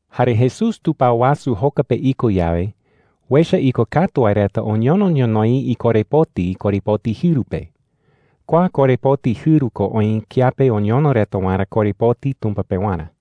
Jare Jesús tupao wasu joka pe iko yawe, uecha ikokatu wae reta oñono ñonoï ikorepoti korepoti jɨru pe. Kua korepoti jɨru ko oï kiape oñono reta waerä korepoti Tumpa pewarä.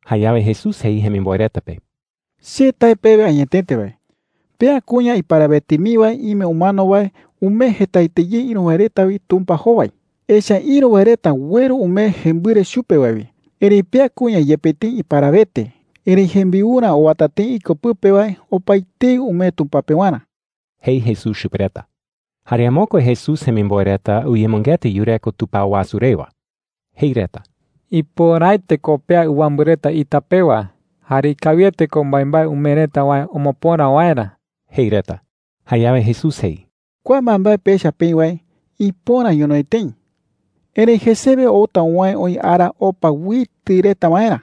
Jayawe Jesús jei jemimboe reta pe: “Che tae pewe añetete wae, pea kuña iparawete mii wae ime umano wae umee jetaete ye ïru wae reta wi Tumpa jowai,” jei. “Echa’ä ïru wae reta ueru umee jembɨre chupe wae wi. Erëi pea kuña, yepe tëi iparawete, erëi jembiurä owata tëi iko pɨpe wae opaetei umee Tumpa pewarä,” jei Jesús chupe reta. Jare amokue Jesús jemimboe reta uyemɨngeta yureko tupao wasu rewa. Jei reta: “Ipöraete ko pea ɨwambɨ reta ita pewa. Jare ikawiete ko mbaembae umee reta wae omopöra waerä,” jei reta. Jayawe Jesús jei: “Kua mbaembae pecha peï wae, ipöra ñonoï tëi,” jei. “Erëi jesewe outa uwäe oï ara opa uitɨ reta waerä.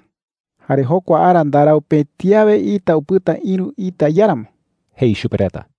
Jare jokua ara ndarau pëti awe ita upɨta ïru ita iáramo,” jei chupe reta.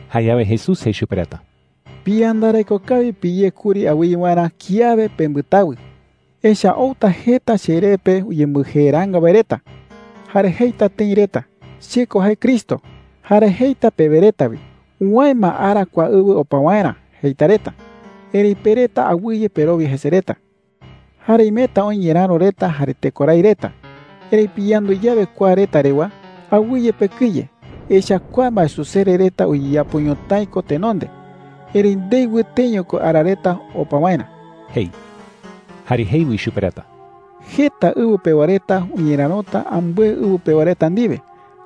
Jayawe Jesús jei chupe reta: “Piyandareko kawi piyé kuri awɨye waerä kiawe pembɨtawɨ,” jei chupe reta. “Echa’ä outa jeta cheree pe uyembɨjeeraanga wae reta. Jare jeita tëi reta: ‘Che ko jae Cristo.’ Jare jeita pewe reta wi: ‘Uwäe ma ara kua ɨwɨ opa waerä,’ jeita reta. Erëi pe reta awɨye perowia jese reta,” jei chupe reta. “Jare imeta oï ñeräro reta jare tekorái reta. Erëi piyandu yawe kua reta rewa, awɨye pekɨye. Echa’ä kua mbaesusere reta uyeyapo ñotái ko tenonde. Erëi ndei wɨteño ko ara reta opa waerä,” jei. Jare jei wi chupe reta: “Jeta ɨwɨ pewa reta uñerärota ambɨe ɨwɨ pewa reta ndiwe,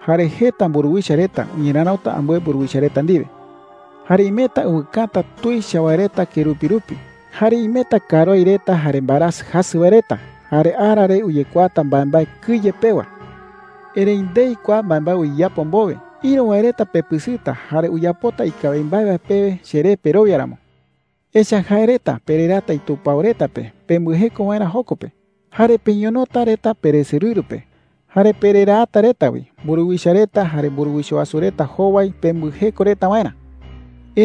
jare jeta mburuwicha reta uñerärota ambɨe mburuwicha reta ndiwe,” jei chupe reta. “Jare imeta ɨwɨkäta tuicha wae reta kerupi rupi. Jare imeta karuái reta jare mbaerasɨ jasɨ wae reta. Jare ara re uyekuaata mbaembae kɨye pewa,” jei. “Erëi ndei kua mbaembae uyeyapo mbowe, ïru wae reta pepɨsɨta jare uyapota ikawi mbae wae pewe cheré perowia ramo,” jei. “Echa’ä jae reta pereraata itupao reta pe pembɨjeko waerä joko pe. Jare peñonota reta peresorɨru pe. Jare pereraata reta wi mburuwicha reta jare mburuwicha wasu reta jowai pembɨjeko reta waerä,” jei.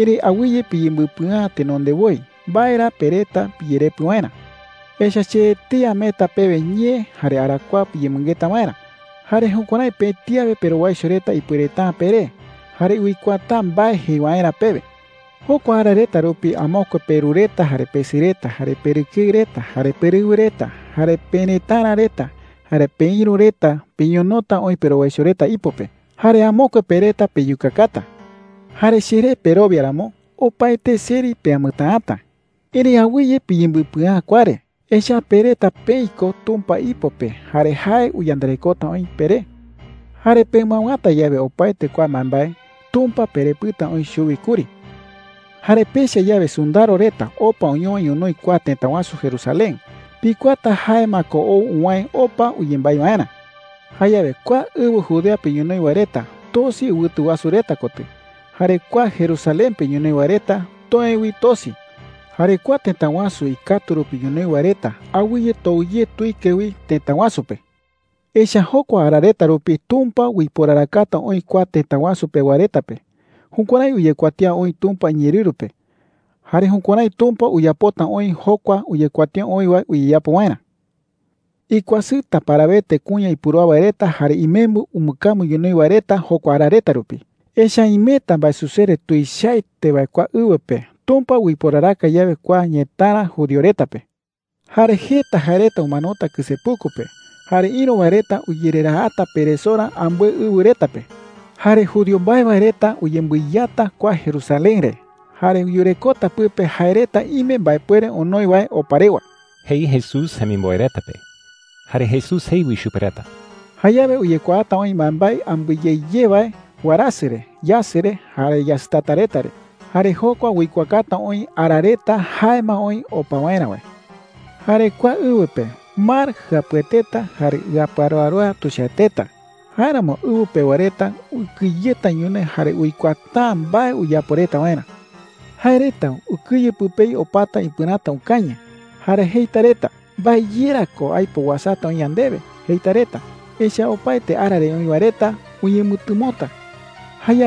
“Erëi awɨye piyembɨpɨa’ä tenonde woi mbae ra pereta piyerepɨ waerä. Echa’ä che etei ameeta pewe ñee jare arakuaa piyemɨngeta waerä. Jare jukuärái pëti awe perowaicho reta ipuereta’ä peré jare uikuaata’ä mbae jei waerä pewe,” jei chupe reta. “Jokua ara reta rupi amokue peru reta jare pesɨ reta, jare perɨkeɨ reta jare perɨwɨ reta, jare perëtara reta, jare peïru reta peñonota oï perowaicho reta ipo pe. Jare amokue pe reta peyukakata. Jare cheré perowia ramo, opaete seri peamɨtäata,” jei. “Erëi awɨye piyembɨpɨa’ä kua re. Echa’ä pe reta peï ko Tumpa ipo pe jare jae uyandarekota oï peré,” jei. “Jare pemɨawäta yawe opaete kua mbaembae, Tumpa perepɨta oï chuwi kuri,” jei chupe reta. “Jare pecha yawe sɨndaro reta opa oñowa ñonoï kua tëta wasu Jerusalén, pikuaata jae ma ko ou uwäe opa uyembái waerä,” jei. “Jayawe kua ɨwɨ Judea pe ñonoï wae reta tosi ɨwɨtu wasu reta kotɨ. Jare kua Jerusalén pe ñonoï wae reta toë wi tosi. Jare kua tëta wasu ikatu rupi ñonoï wae reta awɨye tou ye wi tuike tëta wasu pe. Echa’ä jokua ara reta rupi Tumpa uiporarakata oï kua tëta wasu pewa reta pe. Jukuärái uyekuatía oï Tumpa iñeerɨru pe. Jare jukuärái Tumpa uyapota oï jokua uyekuatía oï wae uyeyapo waerä,” jei chupe reta. “¡Ikuasɨta parawete kuña ipurúa wae reta jare imembɨ umbɨkambu ñonoï wae reta jokua ara reta rupi! Echa’ä imeta mbaesusere tuichaete wae kua ɨwɨ pe Tumpa uiporaraka yawe kua ñëtara judío reta pe,” jei. “Jare jeta jae reta umanota kɨsepuku pe. Jare ïru wae reta uyereraata peresorä ambɨe ɨwɨ reta pe,” jei. “Jare judío mbae wae reta uyembɨiyata kua Jerusalén re jare yurekota pɨpe jae reta ime mbaepuere onoi wae opa rewa,” jei Jesús jemimboe reta pe. Jare Jesús jei wi chupe reta: “Jayawe uyekuaata oï mbaembae ambɨe ye ye wae warasɨ re, yasɨ re, jare yasɨtata reta re. Jare jokua uikuaakata oï ara reta jae ma oï opa waerä wae,” jei. “Jare kua ɨwɨ pe, mar jɨapueteta jare ɨaparoaroa tuichaeteta. Jáeramo ɨwɨ pewa reta ukɨyeta ñonoï jare uikuaata’ä mbae uyapo reta waerä,” jei. “Jae reta ukɨye pɨpei opata ipɨräta ukañɨ, jare jeita reta: “¿Mbae ye ra ko aipo uasata oï yandewe?’ jeita reta. Echa’ä opaete ara re oï wae reta uñemɨtɨmota,” jei.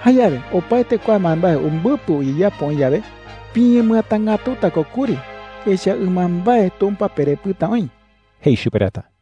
“Jayawe opaete kua mbaembae umbɨpɨ uyeyapo oï yawe, piñemɨatangätuta ko kuri. Echa’ä ɨmambae Tumpa perepɨta oï,” jei chupe reta.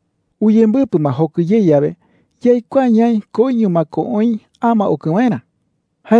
“Uyembɨpɨ ma jokɨ ye yawe, yaikuaa ñaï koiño ma ko oï ama okɨ waerä,” jei.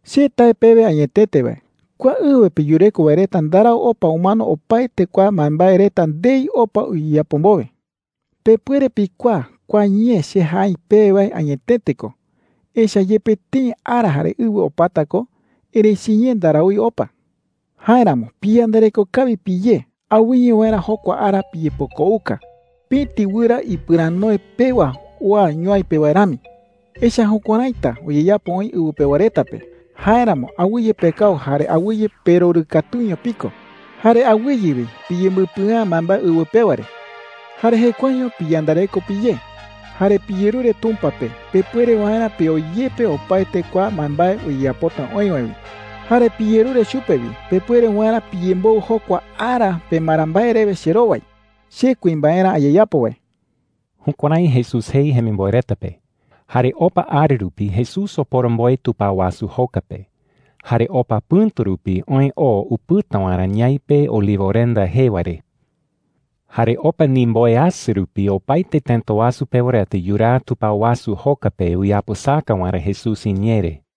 “Che tae pewe añetete wae, kua ɨwɨ pe yureko wae reta ndarau opa umano opaete kua mbaembae reta ndei opa uyeyapo mbowe,” jei. “Pepuere pikuaa kua ñee che jae aï pewe wae añetete ko. Echa’ä yepe tëi ara jare ɨwɨ opata ko, erëi chiñee ndaraúi opa,” jei chupe reta. “Jáeramo piyandareko kawi piyé awɨye waerä jokua ara piyepokouka pëti wɨra ipɨranoe pewa oa ñuai pe wae rami,” jei. “Echa’ä jukuäraita uyeyapo oï ɨwɨ pewa reta pe. Jáeramo awɨye pekau jare awɨye perorɨkatuño piko. Jare awɨye wi piyembɨpɨa’ä mbaembae ɨwɨ pewa re,” jei. “Jare jekuaeño piyandareko piyé. Jare piyerure Tumpa pe pepuere waerä peoyepe opaete kua mbaembae uyeyapota oï wae wi. Jare piyerure chupe wi pepuere waerä piyemboɨ jokua ara pemara mbae rewe cherowai, che kuimbaerä ayeyapo wae.” Jukuärái Jesús jei jemimboe reta pe. Jare opa ara rupi Jesús oporomboe tupao wasu joka pe. Jare opa pɨ̈tu rupi oë oo upɨta waerä ñaipe Olivorenda jee wae re. Jare opa ndimboweasɨ rupi opaete tëta wasu pewa reta yuraa tupao wasu joka pe uyapɨsaka waerä Jesús iñee re.